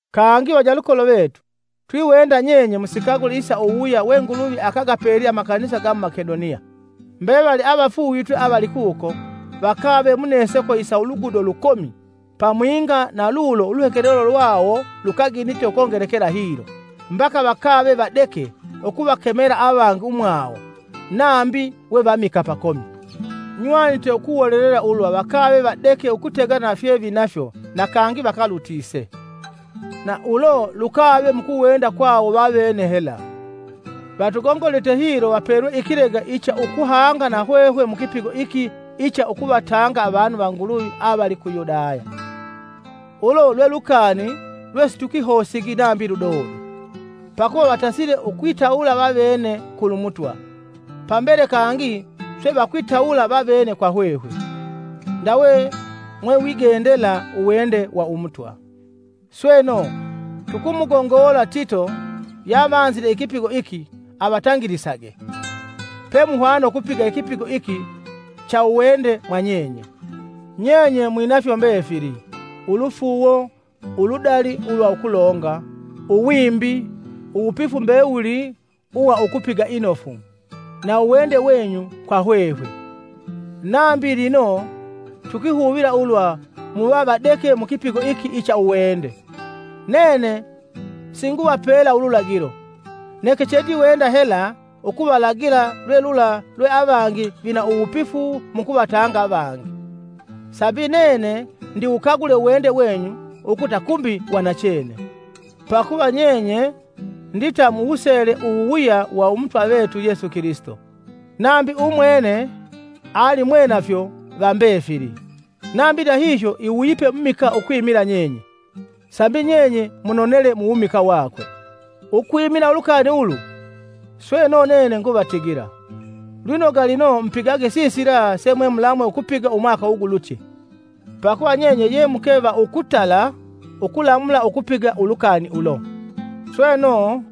Kangi vanyalukolo vetu, twiwenda nyenye musikagule isa uwuwuya we Nguluvi akagapelye amakanisa ga mu Makedoniya. Mbevali avafuuvitwe avali kuko, vakave muneseko isa ulugudo lukomi, pamwinga na lulo uluhekelelo lwawo lukaginite ukongelekela hilo, mbaka vakave vadeke ukuvakemela avangi umwawo, nambi we vamikaa pakomi. Nywanite ukuwolelela ulwa vakave vadeke ukutegana na fye finafyo na kangi vakalutise. Na ulo lukave mukuwenda kwawo vavene hela, Vatugongolite hilo vapelwe ikilega icha ukuhanga nahwehwe mu kipigo iki icha ukuvatanga avanu va Nguluvi avali ku Yudaya. Ulo lwe lukani lwesitukahosigi nambi ludodo! Pakuva vatasile ukwitawula vavene kulu Mutwa, Pambele kangi swe vakwitawula vavene kwa hwehwe, ndawe mwewigendela uwende wa Umutwa. Sweno, tukumugongola Tito yavanzile ikipigo iki avatangilisage, pemuhwana ukupiga ikipigo iki cha uwende mwa nyenye. Nyenye mwinafyo mbefili: ulufuuwo, uludali ulwa ukulonga, uwimbi; uwupifu mbewuli uwa ukupiga inofu, na uwende wenyu kwa hwehwe. Nambi lino, tukwihuvila ulwa muva vadeke mu kipigo iki icha uwende. Nene singuvapela ululagilo, neke chendiwenda hela ukuvalagila lwe lula lwe avangi vina uwupifu mukuvatanga avangi, sambi nene ndiwukagule uwende wenyu ukuta kumbi wa nachene. Pakuva nyenye ndita muwusele uwuwuya wa Umutwa vetu Yesu Kilisito: nambi umwene, ali mwenafyo va mbefili, nambi ndahihyo iwuyipe mumikaa ukwimila nyenye, sambi nyenye munonele mu wumikaa wakwe. Ukwimila ulukani ulu, sweno nene nguvatigila: lwinoga lino mupigage sisila semwemulamwe ukupiga umwaka ugulutye. Pakuva nyenye ye muke va ukutala ukulamula ukupiga ulukani ulo. Sweno,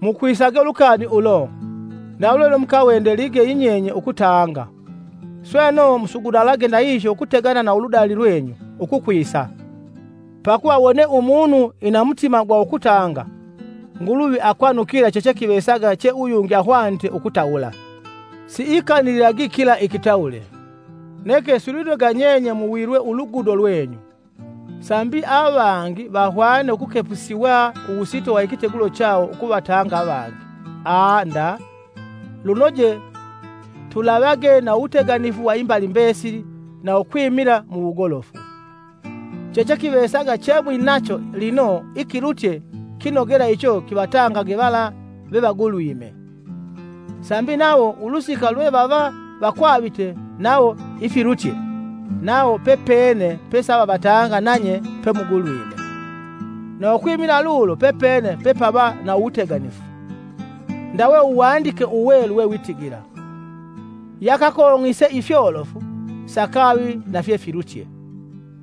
mukwisage ulukani ulo; ndawe lwe mukawendelige yinyenye ukutanga, sweno musugunalage ndahihyo ukutegana na uludali lwenyu, ukukwisa. Pakuva wone umunu ina mutima gwa ukutanga, Nguluvi akwanukila chechekivesaga che uyungi ahwanite ukutawula: siaikanilila kila ikitawule. Neke silwinoga nyenye muwilwe uludugo lwenyu, sambi avangi vahwene ukukepusiwa uwusito wa ikitegulo chawo ukuvatanga avangi, aa nda, lunoje tulavage na uwuteganifu wa imbali mbesili na ukwimila mu wugolofu. Chechekivesaga chemwinacho lino ikilutye kinogela icho kivatangage vala vevagulwime, sambi nawo ulusika lwe vava vakwavite nawo ifilutye, nawo pepene pesavavatanga nanye pemugulwime, na ukwimila lulo pepene pepava na uwuteganifu. Ndawe Uwandike Uwelu wewitigila, “Yakakong'ise ifyolofu, sakavi nafye filutye,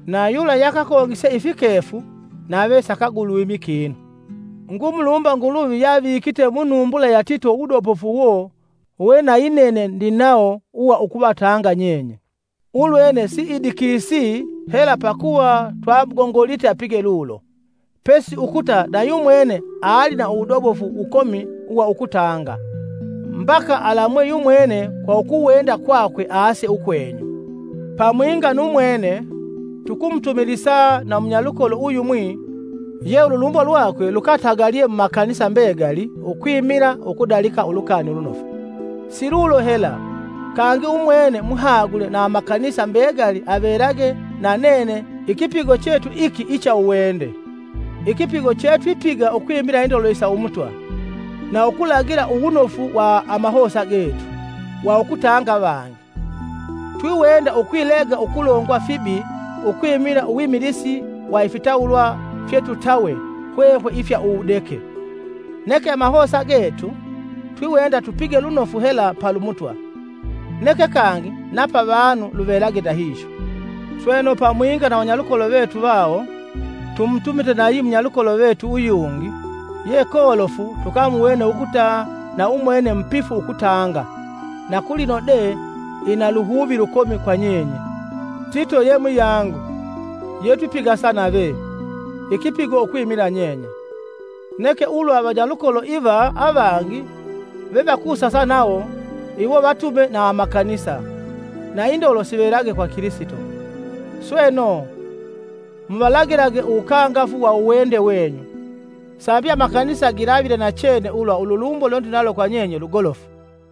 na yula yakakong'ise ifikefu nave sakagulwimi kinu.” Ngumulumba Nguluvi yavikite munumbula ya Tito uwudobofu uwo we nayinene ndinawo uwa ukuvatanga nyenye. Ulwene siidikisi hela pakuva twamugongolite apige lulo, pesi ukuta na yumwene ali na uwudobofu wukomi uwa ukutanga, mbaka alamwe yumwene kwa ukuwenda kwakwe aase ukwenyu. Pamwinga nu mwene, tukumutumilisa na munyalukolo uyumwi ye ululumbo lwakwe lukatagalye mu makanisa mbegali ukwimila ukudalika Ulukani Ulunofu. Si lulo hela, kangi umwene muhagule na amakanisa mbegali avelage na nene petwipiga ikipigo chetu iki icha uwende, ikipigo chetwipiga ukwimila indolo isa Umutwa na ukulagila uwunofu wa amahosa getu, wa ukutanga avangi. Twiwenda ukwilega ukulongwa fibi ukwimila uwimilisi wa ifitawulwa fyetutawe hwehwe ifya uwudeke. Neke amahosa getu, twiwenda tupige lunofu hela palu Mutwa, neke kangi na pavanu luvelage ndahihyo. Sweno pamwinga na vanyalukolo vetu vawo, tumutumite nayi munyalukolo vetu uyungi, ye kolofu tukamuwene ukuta na umwene mupifu ukutanga, na kulino de ina luhuvi lukomi kwa nyenye. Tito ye muyangu, yetwipigasa nave, ikipigo ukwimila nyenye; neke ulwa vanyalukolo iva avangi vevakusasa nawo, iwo vatume na amakanisa, na indolo sivelage kwa Kilisito. Sweno, muvalagilage uwukangafu wa uwende wenyu, sambi amakanisa gilavile nachene ulwa ululumbo lwendinalo kwa nyenye ukuta lwe lugolofu.